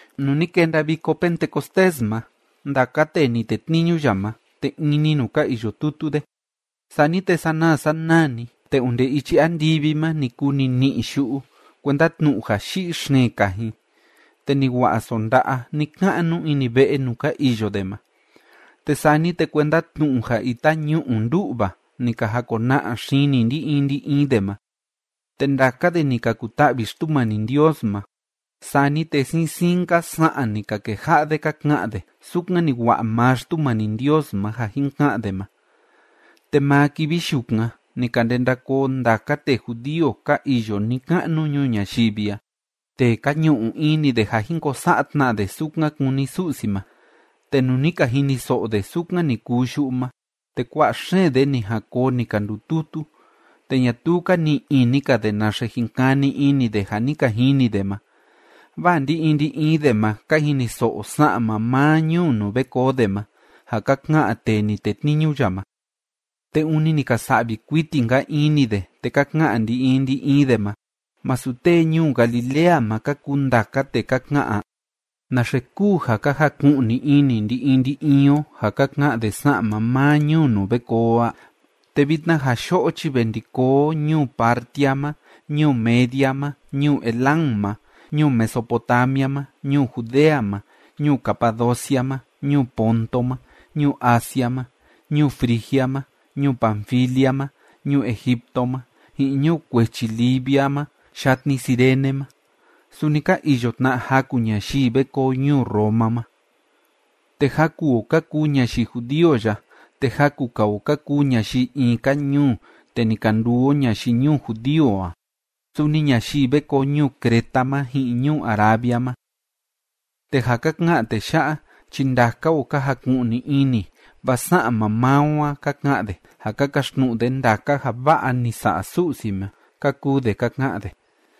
Nuu ni kenda Viko Pentecostés ma, ndaka tee ni tetniñu ya ma, te in‑ni nuu ka iyo tutu de. Sani te sanaa sanaa‑ni, te onde ichi andivi ma ni kuu nini'i yu'u kuenda tnu'u ja yi'i xeen kajin, te ni wa'a sonda'a ni‑ka'nu ini ve'e nuu ka iyo de ma. Te sani te kuenda tnu'u ja ita ñu'u ndú'va ni ka jakona'a xini ndi‑in ndi‑in de ma. Te ndaka de ni ka kuta'vi Xtumani Ndios ma. Sani te siin siin‑nka sa'an ni ka keja'a de ka ka'an de, sukan ni wa'a maa Xtumani Ndios ma ja jin ka'an de ma. Te maa kivi yukan ni ka ndenda koo ndaka tee judío ka iyo ni‑ka'nu ñuu ñayivi a tee ka ñu'u ini de ja jin ko sa'a tna de sukan kúni Su'si ma. Te nuu ni ka jiniso'o de sukan ni kuu yu'u ma, te kua'a xeen de ni jan koo ni ka ndututu, te ñatuu ka ni'i ini‑ka de naxe jin kani ini de ja ni ka jini de ma, vaa ndi‑in ndi‑in de ma ka jiniso'o sa'an maa maa ñuu nuu ve koo de ma ja ka ka'an tee ni tetniñu ya ma. Te ûni ni ka sa'vi kuiti‑nka ini de, te ka ka'an ndi‑in ndi‑in de ma: ―¿Masu tee ñuu Galilea ma ka kuu ndaka tee ka ka'an a? ¿Naxe kúu ja ka jaku'ni ini ndi‑in ndi‑in o ja ka ka'an de sa'an maa maa ñuu nuu ve koo o a? Te vitna ja yo'o chi ve ndi koo o ñuu Partia ma, ñuu Media ma, ñuu Elam ma, ñuu Mesopotamia ma, ñuu Judea ma, ñuu Capadocia ma, ñuu Ponto ma, ñuu Asia ma, ñuu Frigia ma, ñuu Panfilia ma, ñuu Egipto ma, ji'in ñuu kuechi Libia ma yatni Cirene ma. Suni ka iyo tna jaku ñayii ve koo ñuu Roma ma. Te jaku o ka kuu ñayii judío ya, te jaku‑ka o ka kuu ñayii in‑ka ñuu te ni ka nduu o ñayii ñuu judío a. Suni ñayii ve koo ñuu Creta ma ji'in ñuu Arabia ma. Te ja ka ka'an tee ya'a chi ndaka o ka jaku'ni ini, vaa sa'an maa maa o a ka ka'an de, ja ka kaxtnu'u de ndaka ja va'a ni sa'a Su'si ma ―ka kuu de ka ka'an de.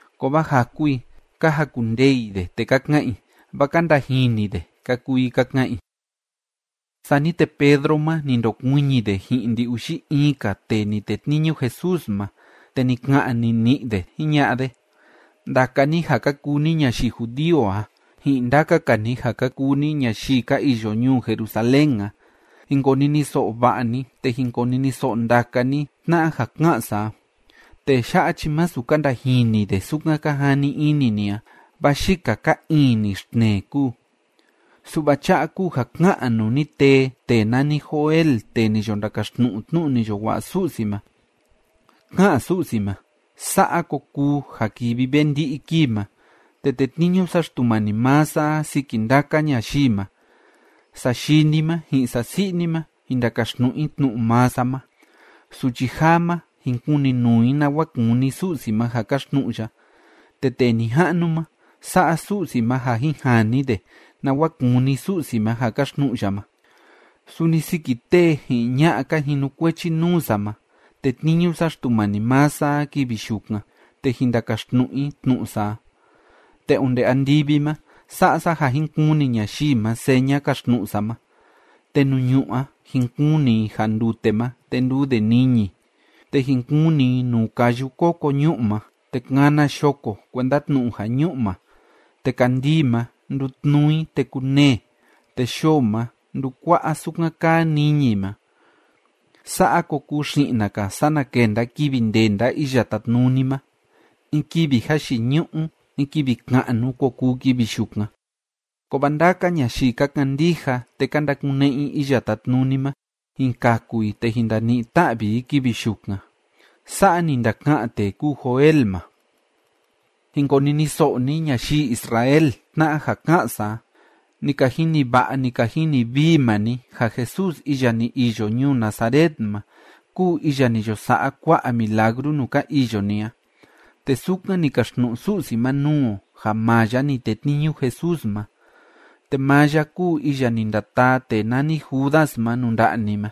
Kovaa jaku i, ka jakundee i de, te ka ka'an i: ―Vâa ka ndajini de ―ka kuu i ka ka'an i. Sani te Pedro ma, ni ndokuiñi de ji'in ndi‑uxi in‑ka tee ni tetniñu Jesús ma, te ni ka'an nini'i de jiña'a de: ―Ndaka ni ja ka kuu ni ñayii judío a ji'in ndaka‑ka ni ja ka kuu ni ñayii ka iyo ñuu Jerusalén a, jin koniniso'o va'a ni, te jin koniniso'o ndaka ni tna'a ja ká'an sa a. Tee ya'a chi masu ka ndajini de sukan ka jani ini ni a, vaa yika ka iin‑ni xtnee kúu. Su'va cha'a kúu ja ká'an nuu ni tee tee nani Joel tee ni yo ndakaxtnu'u tnu'u ni yo wa'a Su'si ma: Ká'an Su'si ma: Sa'a ko kuu ja kivi ve ndi'i kii ma, te tetniñu sa Xtumani maa sa a siki ndaka ñayii ma. Sayii ni ma ji'in sasi'i ni ma, jin ndakaxtnu'u i tnu'u maa sa ma. Suchi jaa ma, jin kuninuu i nawa kúni Su'si ma ja kaxtnu'u ya, te tee nija'nu ma, sa'a Su'si ma ja jin jani de nawa kúni Su'si ma ja kaxtnu'u ya ma. Suni siki tee ji'in ña'a ka jinukuechi nuu sa ma tetniñu sa Xtumani maa sa a kivi yukan, te jin ndakaxtnu'u i tnu'u sa a. Te onde andivi ma sa'a sa ja jin kuni ñayii ma seña kaxtnu'u sa ma, te nuu ñu'ú a jin kuni i ja ndute ma, te nduu de niñi, te jin kuni i nuu kayu koko ñu'u ma, te kana yoko kuenda tnu'u ja ñu'ma. Te kandii ma, ndutnuu i te kunee, te yoo ma ndukua'a sukan kaa niñi ma. Sa'a ko kuu xi'na‑ka sana kenda kivi ndenda Iya Tátnuni ma. In kivi jayiñu'u, in kivi ka'nu ko kuu kivi yukan. Kovaa ndaka ñayii ka kandija te ka ndakune'e i Iya Tátnuni ma, jin kaku i te jin ndani'i ta'vi i kivi yukan. Sa'a ni ndaka'an tee kúu Joel ma. ’Jin koniniso'o ni ñayii Israel tna'a ja ká'an sa a: Ni ka jini va'a, ni ka jini vii maa ni ja Jesús iya ni iyo ñuu Nazaret ma kúu iya ni yo sa'a kua'a milagru nuu ka iyo ni a, te sukan ni kaxtnu'u Su'si ma nuu o ja maa ya ni tetniñu Jesús ma. Te maa ya kúu iya ni ndataa tee nani Judas ma nuu nda'a ni ma,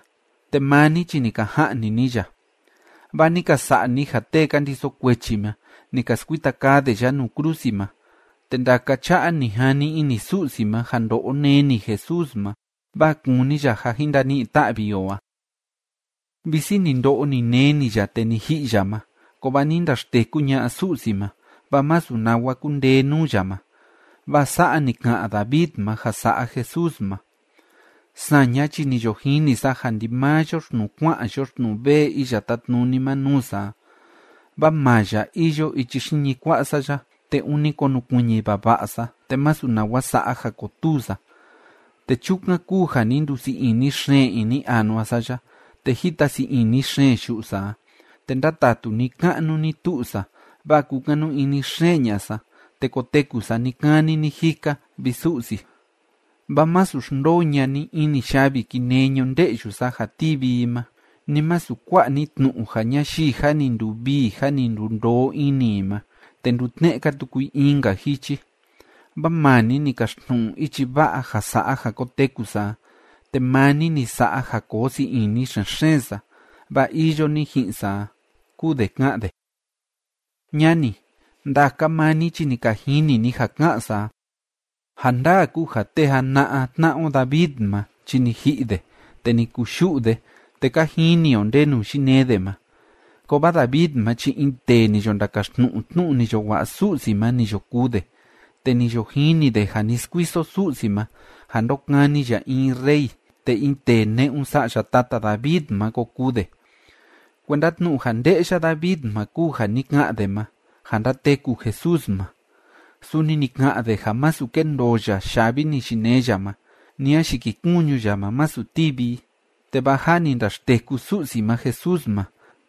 te maa ni chi ni ka ja'ni ni ya, vaa ni ka sa'a ni ja tee ka ndiso kuechi ma, ni ka skuita kaa de ya nuu krusi ma. Te ndaka cha'a ni jani ini Su'si ma ja ndo'o neni Jesús ma, vaa kúni ya ja jin ndani'i ta'vi o a. Visi ni ndo'o, ni neni ya te ni ji'i ya ma, kovaa ni ndaxteku ña'a Su'si ma, vaa masu nawa kundee nuu ya ma. Vaa sa'a ni ka'an David ma ja sa'a Jesús ma: Saña chi ni yo jini sa ja ndimaa yoxtnuu kua'an yoxtnuu vee Iya Tátnuni ma nuu sa a. Vaa maa ya iyo ichi xiñi kua'a sa ya, te ûni konukuiñi vava'a sa, te masu nawa sa'a ja kotuu sa. Te chukan kúu ja ni ndusii ini xeen ini anua sa ya, te jita sii ini xeen yu'u sa a, te ndátatu ni‑ka'nu ni‑tu'u sa, vaa kúkanu ini xeen ña'a sa, te koteku sa ni‑kani ni‑jika, vi Su'si. Vaa masu xndoo ña'a ni ini yavi kinee ñunde'yu sa ja tivi i ma, ni masu kua'a ni tnu'u ja ñayii jâ ni nduvii jâ ni ndundoo ini i ma, te ndutne'e‑ka tuku i in‑ka jichi. Vaa maa ni ni kaxtnu'u ichi va'a ja sa'a ja koteku sa a, te maa ni ni sa'a ja koo sii ini xen‑xeen sa, vaa iyo ni ji'in sa a, kúu de ká'an de. ’Ñani, ndaka maa ni chi ni ka jini ni ja ká'an sa a. Ja ndaa kúu ja tee jana'a tna'a o David ma chi ni ji'i de, te ni kuyu'u de, te ka jini o ndenu yinee de ma. Kovaa David ma chi in tee ni yo ndakaxtnu'u tnu'u ni yo wa'a Su'si ma ni yo kuu de, te ni yo jini de ja ni skuiso Su'si ma ja ndokani ya in rey, te in tee ne'un sa'ya tata David ma ko kuu de. Kuenda tnu'u ja nde'ya David ma kúu ja ni ka'an de ma, ja ndateku Jesús ma. Suni ni ka'an de ja masu kendoo ya yavi ni yinee ya ma, ni a yikikuñu ya ma, masu tivi i. Te vaa jâ ni ndaxteku Su'si ma Jesús ma,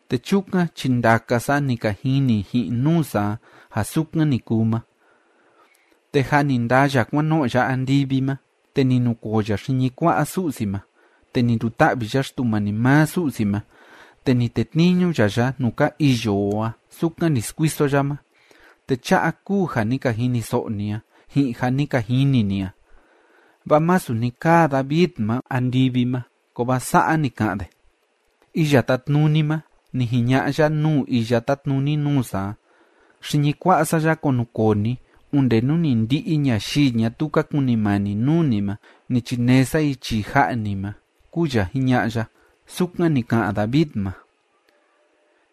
te chukan chi ndaka sa ni ka jini ji'in nuu sa a ja sukan ni kuu ma. Te jâ ni ndaa ya kuan no'o ya andivi ma, te ni nukoo ya xiñi kua'a Su'si ma, te ni nduta'vi ya Xtumani maa Su'si ma, te ni tetniñu ya ya nuu ka iyo o a sukan ni skuiso ya ma. Te cha'a kúu ja ni ka jiniso'o ni a, ji'in ja ni ka jini ni a. Vaa masu ni kaa David ma andivi ma, kovaa sa'a ni ka'an de: Iya Tátnuni ma, ni jiña'a ya nuu iya tátnuni nuu sa a: “Xiñi kua'a sa ya kunukoo ni, onde nú ni ndi'i ñayii ñatuu ka kunimani nuu ni ma, ni chinee sa i chii ja'a ni ma”, kúu ya jiña'a ya. Sukan ni ka'an David ma.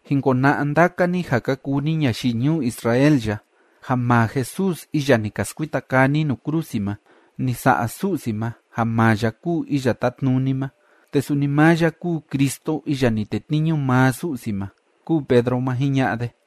’Jin kona'a ndaka ni ja ka kuu ni ñayii ñuu Israel ya ja maa Jesús iya ni ka skuita kaa ni nuu krusi ma, ni sa'a Su'si ma ja maa ya kúu Iya Tátnuni ma, te suni maa ya kúu Cristo iya ni tetniñu maa Su'si ma ―kúu Pedro ma jiña'a de.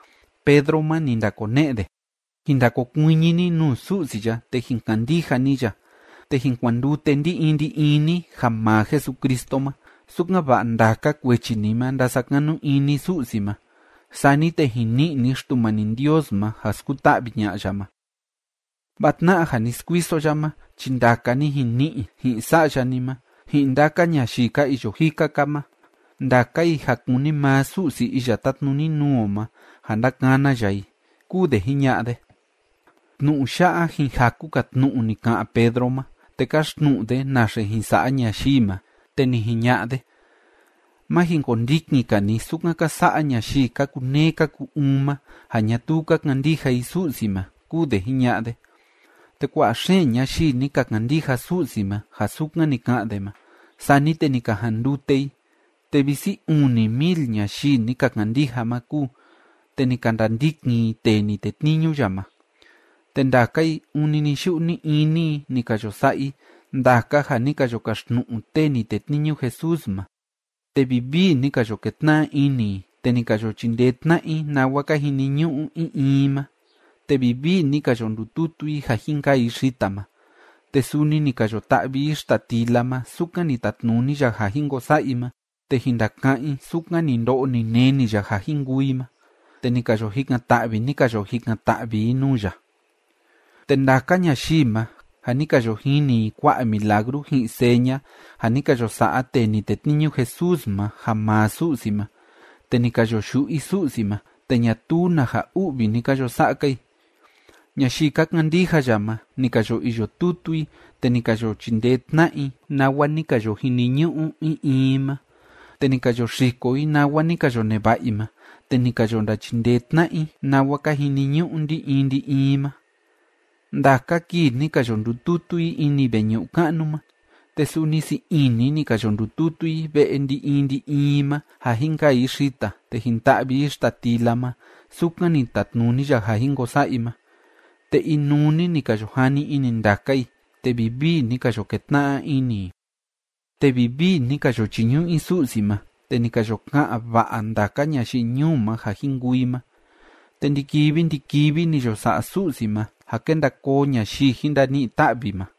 Pedro ma, ni ndakone'e de: ―Jin ndakokuiñi ni nuu Su'si ya, te jin kandija ni ya, te jin kuandute ndi‑in ndi‑in ni ja maa Jesucristo ma, sukan‑va'a ndaka kuechi ni ma ndasakanu ini Su'si ma. Sani te jin ni'i ni Xtumani Ndios ma ja skuta'vi ña'a ya ma. Vaa tna'a ja ni skuiso ya ma chi ndaka ni jin ni'i, ji'in sa'ya ni ma, ji'in ndaka ñayii ka iyo jika‑ka ma, ndaka i ja kúni maa Su'si iya tátnuni nuu o ma ja ndakana ya i ―kúu de jiña'a de. Tnu'u ya'a ji'in jaku‑ka tnu'u ni ka'an Pedro ma, te káxtnu'u de naxe jin sa'a ñayii ma. Te ni jiña'a de: ―Má jin kondikin‑ka ni sukan ka sa'a ñayii ka kuneé ka ku‑uun ma ja ñatuu ka kandija i Su'si ma ―kúu de jiña'a de. Te kua'a xeen ñayii ni ka kandija Su'si ma ja sukan ni ka'an de ma, sani te ni ka jandute i, te visi uni mil ñayii ni ka kandija ma kúu, te ni ka ndandikin i tee ni tetniñu ya ma. Te ndaka i ûni ni‑yu'u ni‑ini i ni ka yo sa'a i ndaka ja ni ka yo kaxtnu'u tee ni tetniñu Jesús ma, te vivii ni ka yo ketna'a ini i, te ni ka yo chindee tna'a i nawa ka jiniñu'u in in i ma, te vivii ni ka yo ndututu i ja jin kaa i xita ma, te suni ni ka yo ta'vi i xita tila ma sukan ni tatnuni ya ja jin ko sa'a i ma te jin ndaka'án i sukan ni ndo'o ni neni ya ja jin kuu i ma, te ni ka yo jikan‑ta'vi, ni ka yo jikan‑ta'vi i nuu ya. Te ndaka ñayii ma, ja ni ka yo jini i kua'a milagru ji'in seña ja ni ka yo sa'a tee ni tetniñu Jesús ma ja maa Su'si ma, te ni ka yo yu'u i Su'si ma, te ñatuu na ja u'vi ni ka yo sa'a‑ka i. Ñayii ka kandija ya ma, ni ka yo iyo tutu i, te ni ka yo chindee tna'a i nawa ni ka yo jiniñu'u in in i ma. Te ni ka yo xiko i nawa ni ka yo neva'a i ma, te ni ka yo ndachindee tna'a i nawa ka jiniñu'u ndi‑in ndi‑in i ma. Ndaka kii ni ka yo ndututu i ini veñu'u ka'nu ma, te suni sii ini ni ka yo ndututu i ve'e ndi‑in ndi‑in i ma, ja jin kaa i xita te jin ta'vi i xita tila ma sukan ni tatnuni ya ja jin ko sa'a i ma, te inuu‑ni ni ka yo jani ini ndaka i te vivii ni ka yo ketna'a ini i. Te vivii ni ka yo chiñu'u i Su'si ma, te ni ka yo ka'an va'a ndaka ñayii ñuu ma ja jin kuu i ma, te ndi‑kivi ndi‑kivi ni yo sa'a Su'si ma ja kénda koo ñayii jin ndani'i ta'vi ma.